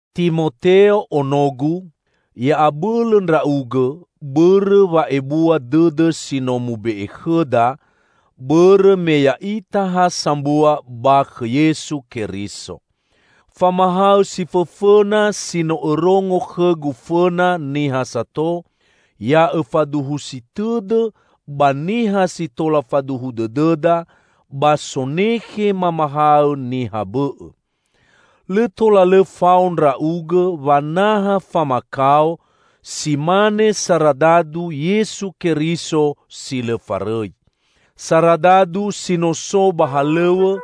Timoteo, onogu! Ya'abõlõ ndra'ugõ bõrõ wa'ebua dõdõ si no mube'e khõda, bõrõ me ya'ita ha sambua ba khõ Yesu Keriso. Famahaõ si fõfõna si no õrongo khõgu fõna niha sato, ya õfaduhusi tõdõ ba niha si tola faduhu dõdõda ba sonekhe mamahaõ niha bõ'õ. Lõ tola lõ fao ndra'ugõ wanaha famakao si mane saradadu Yesu Keriso si lõ farõi. Saradadu si no so ba halõw̃õ,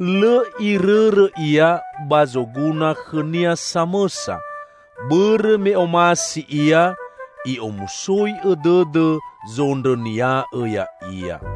lõ irõrõ ia ba zoguna khõnia samõsa, bõrõ me omasi ia i'omusoi'õ dõdõ zondrõnia'õ ya'ia.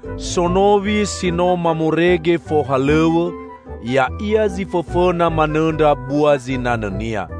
Sonowi si no mamorege fohalõw̃õ, ya'ia zi fõfõna manõndra bua zinanõnia.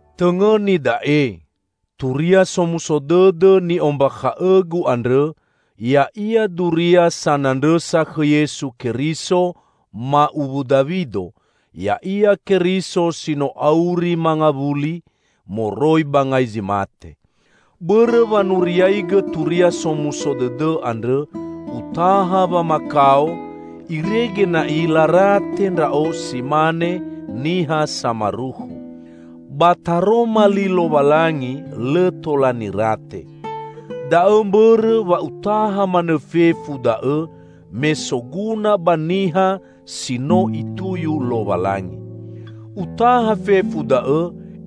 Tõngõni da'e: Turia Somuso Dõdõ ni'ombakha'õgu andrõ ya'ia duria sanandrõsa khõ Yesu Keriso, ma'uwu Dawido; Ya'ia Keriso si no auri mangawuli moroi ba ngai zi mate. Bõrõ wanuriaigõ Turia Somuso Dõdõ andrõ, utaha wamakao; irege na'i larate ndra'o si mane niha samarukhu. Ba Taroma Li Lowalangi lõ tola nirate. Da'õ mbõrõ wa utaha manõ fefu da'õ me soguna ba niha si no Ituyu Lowalangi. Utaha fefu da'õ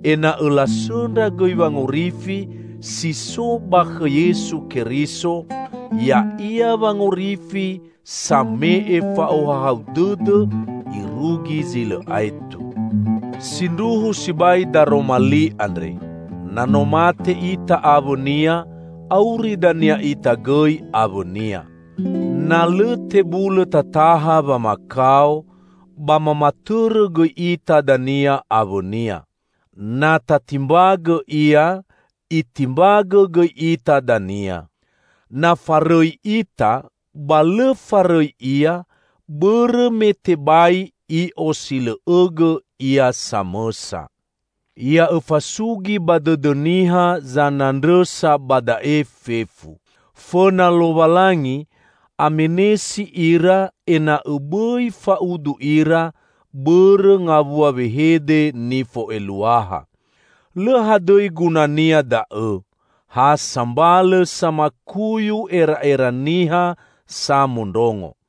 ena'õ lasõndra gõi wangorifi si so ba khõ Yesu Keriso, ya'ia wangorifi same'e fa'ohahau dõdõ irugi zi lõ aetu. Sindruhu sibai daroma li andre, "Na no mate ita awõ-Nia, auri dania ita gõi awõ-Nia. Na lõ tebulõ tataha wamakao, ba mamatõrõ gõi ita dania awõ-Nia. Na tatimbagõ Ia, Itimbagõ gõi ita dania. Na farõi ita, ba lõ farõi Ia, bõrõ me tebai I'osilõ'õgõ Ia samõsa." Ya'õfasugi ba dõdõ niha zanandrõsa ba da'e fefu. Fõna Lowalangi, amenesi ira ena'õ bõi fa'udu ira bõrõ ngawua wehede nifo'eluaha. Lõ hadõi gunania da'õ, ha sambalõ samakuyu era'era niha samondrongo.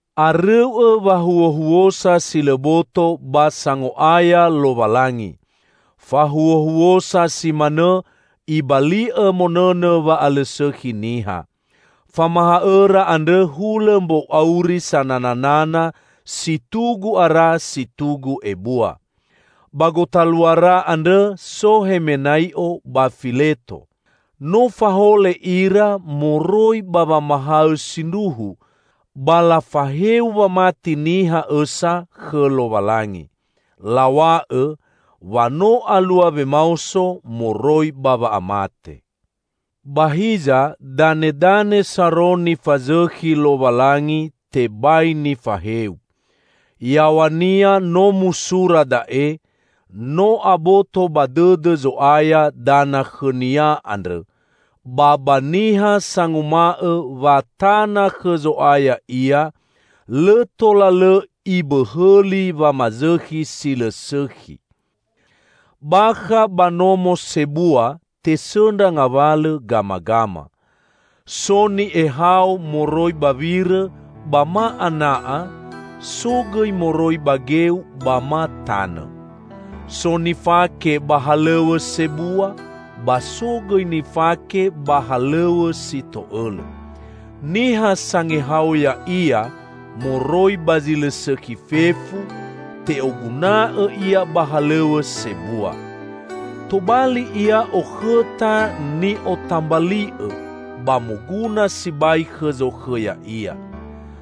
Arõu'õ wahuohuosa si lõ boto ba sango'aya Lowalangi. Fahuohuosa si manõ ibali'õ monõnõ wa'alõsõkhi niha. Famahaõra andrõ hulõ mbou auri sanananana si tugu ara si tugu ebua. Ba gotaluara andrõ so Hemenai'o ba Fileto. No fahole ira moroi ba wamahaõ sindruhu, ba lafaheu wamati niha õsa khõ Lowalangi. Law̃a'õ, wa no alua wemaoso moroi ba wa'amate. Ba hiza, danedane saro nifazõkhi Lowalangi tebai nifaheu. Yaw̃ania no musura da'e, "No aboto ba dõdõ Zo'aya dana khõ-Nia andrõ", ba ba "Niha sanguma'õ wa tana khõ Zo'aya ia, lõ tola lõ ibõhõli wamazõkhi si lõ sõkhi". Bakha ba nomo sebua tesõndra ngawalõ gamagama. So ni'ehao moroi ba wirõ ba ma ana'a, so gõi moroi ba geu ba ma tanõ. So nifake ba halõw̃õ sebua, ba so gõi nifake ba halõw̃õ si to'õlõ. Niha sangehao ya'ia moroi ba zi lõ sõkhi fefu, te'oguna'õ ia ba halõw̃õ sebua. Tobali ia okhõta ni'otambali'õ ba moguna sibai khõ zokhõ ya'ia.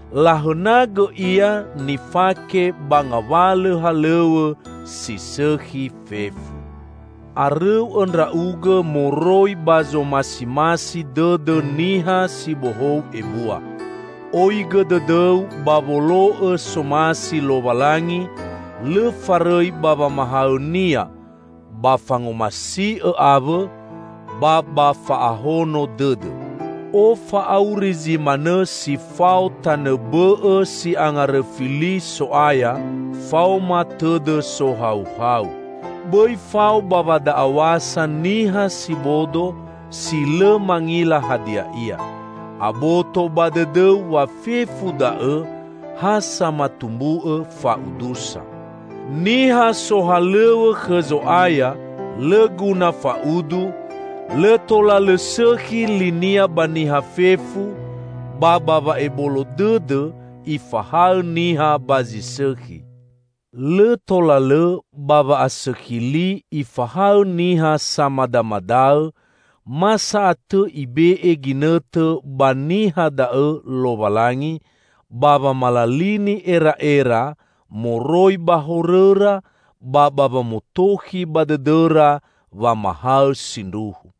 Lahõnagõ ia nifake ba ngawalõ halõw̃õ si sõkhi fefu. Arõu'õ ndra'ugõ moroi zomasimasi dõdõ niha si bohou ebua. Oigõ dõdõu ba wolo'õ somasi Lowalangi, lõ farõi ba wamahaõ-Nia, ba fangomasi'õ awõ, ba ba fa'ahono dõdõ. Ofa'auri zi manõ si fao tanõ bõ'õ si angarõfi li So'aya faoma tõdõ sohauhau. Bõi fao ba wada'aw̃asa niha si bodo si lõ mangila hadia ia. Aboto ba dõdõu wa fefu da'õ ha samatumbu'õ fa'udusa. Niha sohalõw̃õ khõ Zo'aya lõ guna fa'udu; lõ tola lõ sõkhi linia ba niha fefu, ba ba wa'ebolo dõdõ ifahaõ niha ba zi sõkhi. Lõ tola lõ ba wa'asõkhi li ifahaõ niha samadamadaõ; ma sa'atõ Ibe'e ginõtõ ba niha da'õ Lowalangi ba wamalalini era'era moroi ba horõra ba ba wamotokhi ba dõdõra wamahaõ sindruhu.